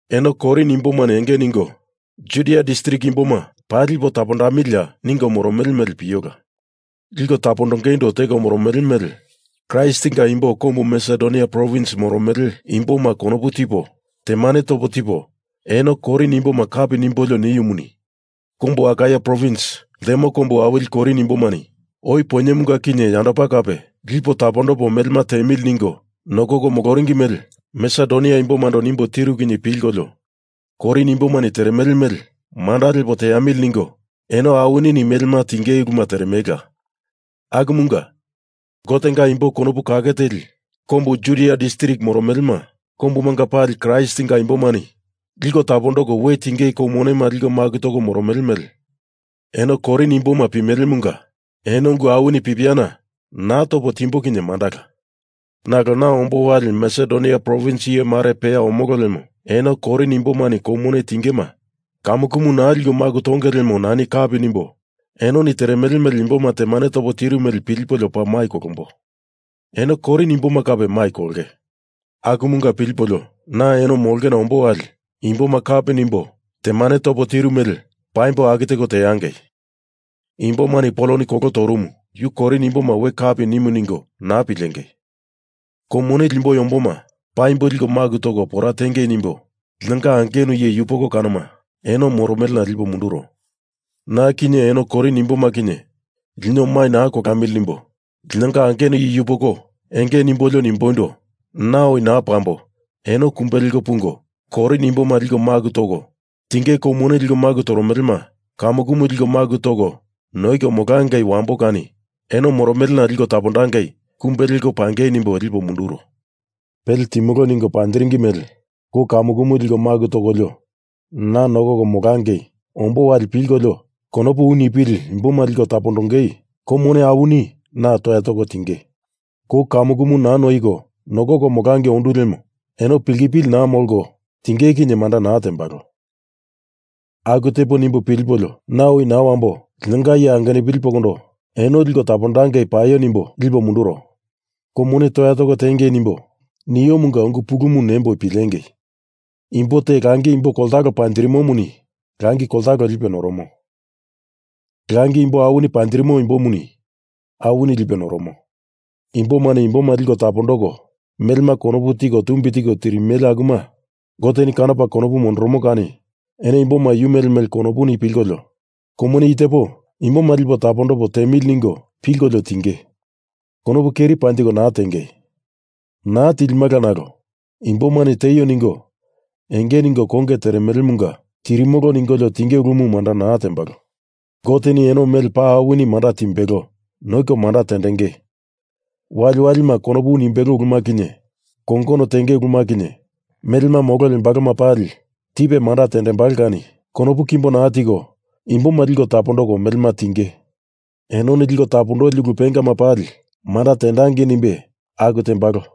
Eno Korin imbomani enge ningo Judia distrik imboma paa lipo tapondamilia ningo moromele mele piola. Liko tapondongeindo teko moromele mele Kraistinga imbo kombu Masedonia provins moromele imboma konopu tipo temane topo tipo eno Korin imboma kapi nimbolio niumuni, kombu Akaia provins ltemo kombu awili Korin imbomani oi poinyemunga kinye yandopa kape lipo tapondopo melema tiemili ningo nokoko moloringi mele Masedonia imbomando nimbo tiru kinye pilkolio Korin imbomani teremele mele manda lepo teamili ningo eno awinini melema tinge uluma teremelela, akumunga, Gotenga imbo konopu kake teli kombu Judia distrik moromelema kombumanga pali Kraistinga imbomani liko tapondoko we tinge kou monema liko maku toko moromele mele eno Korin imboma pimelemunga eno ungu awini pipiana naa topo timbo kinye mandala. Nalo na ombo wali Masedonia provins iye mare peya omolo lemo eno Korin imbomani kou mone tingema kamukumu naa liko maku tonge lemo nani kapi nimbo enoni teremele mele imboma temane topo tiru mele pilipolio paa mai kolombo. Eno Korin imboma kape mai kolonge. Akumunga pilipolio, na eno molongena ombo wali imboma kapi nimbo temane topo tiru mele paimbo aku teko teangei. Imbomani Poloni kolo torumu, yuni Korin imboma we kapi nimu ningo naa pilengei! Kou mone limboi omboma paimbo liko maku toko pora tiengei nimbo linonga angenu iye yupoko kanoma eno moromelena lipo munduro. Na kinye eno Korin imboma kinye lino mai naa kolamili nimbo linonga angenu iye yupokondo enge nimbolio nimboindo na oi naa pambo eno kumbe leko pungo, Korin imboma liko tapondoko, tinge kou mone liko maku toromelema kamukumu liko maku toko noiko molangei wambo kani eno moromelena liko tapondangei kumbe leko pangei nimbo lipo munduro. Pele timolo ningo panjiringi mele kou kamukumu liko maku tokolio na nokoko molangei ombo wali pilkolio konopu u nipili imboma liko tapondongei kou mone awini na toya toko tinge. Kou kamukumu naa noiko nokoko molangei ondu lemo eno pilkipili naa molko tinge kinye manda naa tembalo. Aku tepo nimbo pilipolio na oi naa wambo linonga iye angenupili pokondo eno liko tapondangei paio nimbo lipo munduro. Kou mone toya toko tiengei nimbo niomunga ungu pulumu nembo pilengei! Imbo te langi imbo koltalo panjirimomuni langi koltalo lipe noromo. Langi imbo awini panjirimo imbomuni awini lipe noromo. Imbomani imboma liko tapondoko melema konopu tiko tumbi tiko tirimele akuma Goteni kanopa konopu mondoromo kani eno imboma yu mele mele konopuni pilkolio kou mone i tepo imboma lipo tapondopo tiemili ningo pilkolio tiengei. Konopu keri panjiko naa tiengei. Naa tilimala nalo imbomani tieio ningo enge ningo konge teremelemunga tirimolo ningolio tinge ulumu manda naa tembalo. Goteni eno mele paa awini manda timbelo noiko manda tendenge, waliwalima konopu u nimbelo uluma kinye, kongono tenge uluma kinye, melema molo lembaloma pali tipe manda tendembalo kani konopu kimbo naa tiko imboma liko tapondoko melema tiengei. Enoni liko tapondoli ulu pengama pali manda tendangei nimbe aku tembalo.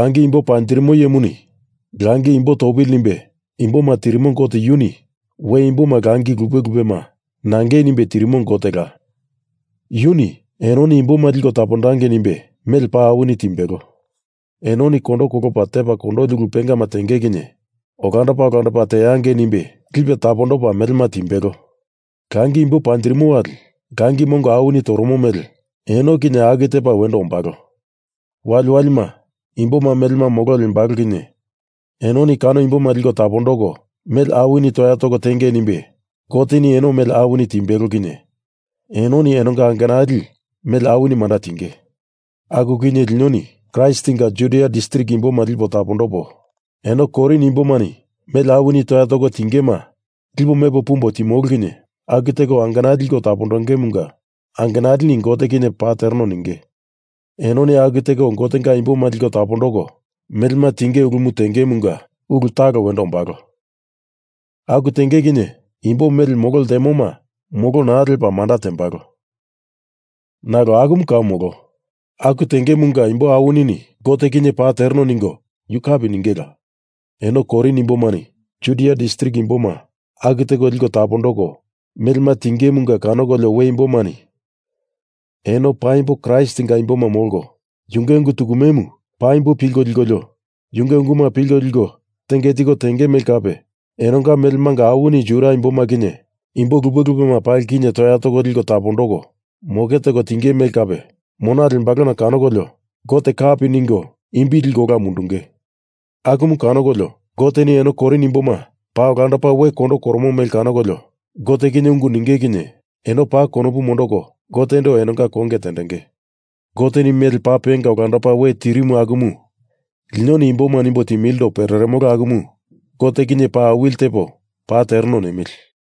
Langi imbo panjirimo iyemuni langi imbo topili nimbe imboma tirimo Gote, yuni we imboma langi lupe lupema nangei nimbe tirimo Gotela, yuni enoni imboma liko tapondangei nimbe mele paa awini timbelo. Enoni kondo kolopa tepa kondoli ulu pengama tenge kinye olandopa olandopa teangei nimbe lipe tapondopa melema timbelo. Langi imbo panjirimo wali langi mongo awini toromo mele eno kinye aku tepa wendo ombalo. Waliwalima, imboma melema molo lembalo kinye enoni kano imboma liko tapondoko mele awini toya toko tiengei nimbe Goteni eno mele awini timbelo kinye enoni enonga angenali mele awini manda tinge. Aku kinye linoni Kraistinga Judia distrik imboma lipo tapondopo, eno Korin imbomani mele awini toya toko tingema lipo mepo pumbo timolo kinye aku teko angenali liko tapondongemunga angenalini Gote kinye paa tereno ninge. Enoni aku teko Gotenga imboma liko tapondoko melema tinge ulumu tengemunga ulu talo wendo ombalo. Aku tenge kinye imbo mele molo ltemoma molo naa lepa manda tembalo. Nalo akumu kau molo. Aku tengemunga imbo awinini Gote kinye paa tereno ningo yu kapi ningela. Eno Korin imbomani Judia distrik imboma aku teko liko tapondoko melema tingemunga kanokolio we imbomani eno paimbo Kraistinga imboma molko, yunge ungu tukumemu paimbo pilko likolio yunge unguma pilko liko tenge tiko tenge mele kape enonga melemanga awini Judia imboma kinye imbo lupe lupema pali kinye toya toko liko tapondoko moke teko tinge mele kape, mona lembalona kanokolio Gote kapi ningo imbi liko ola mundunge. Akumu kanokolio, Goteni eno Korin imboma paa olandopa we kondo koromo mele kanokolio Gote kinye ungu ninge kinye eno paa konopu mondoko Gotendo enonga konge tendenge. Goteni mele paa penga olandopa we tirimu akumu linoni imboma nimbo timilindo pereremolo akumu Gote kinye paa awili tepo paa tereno nemili.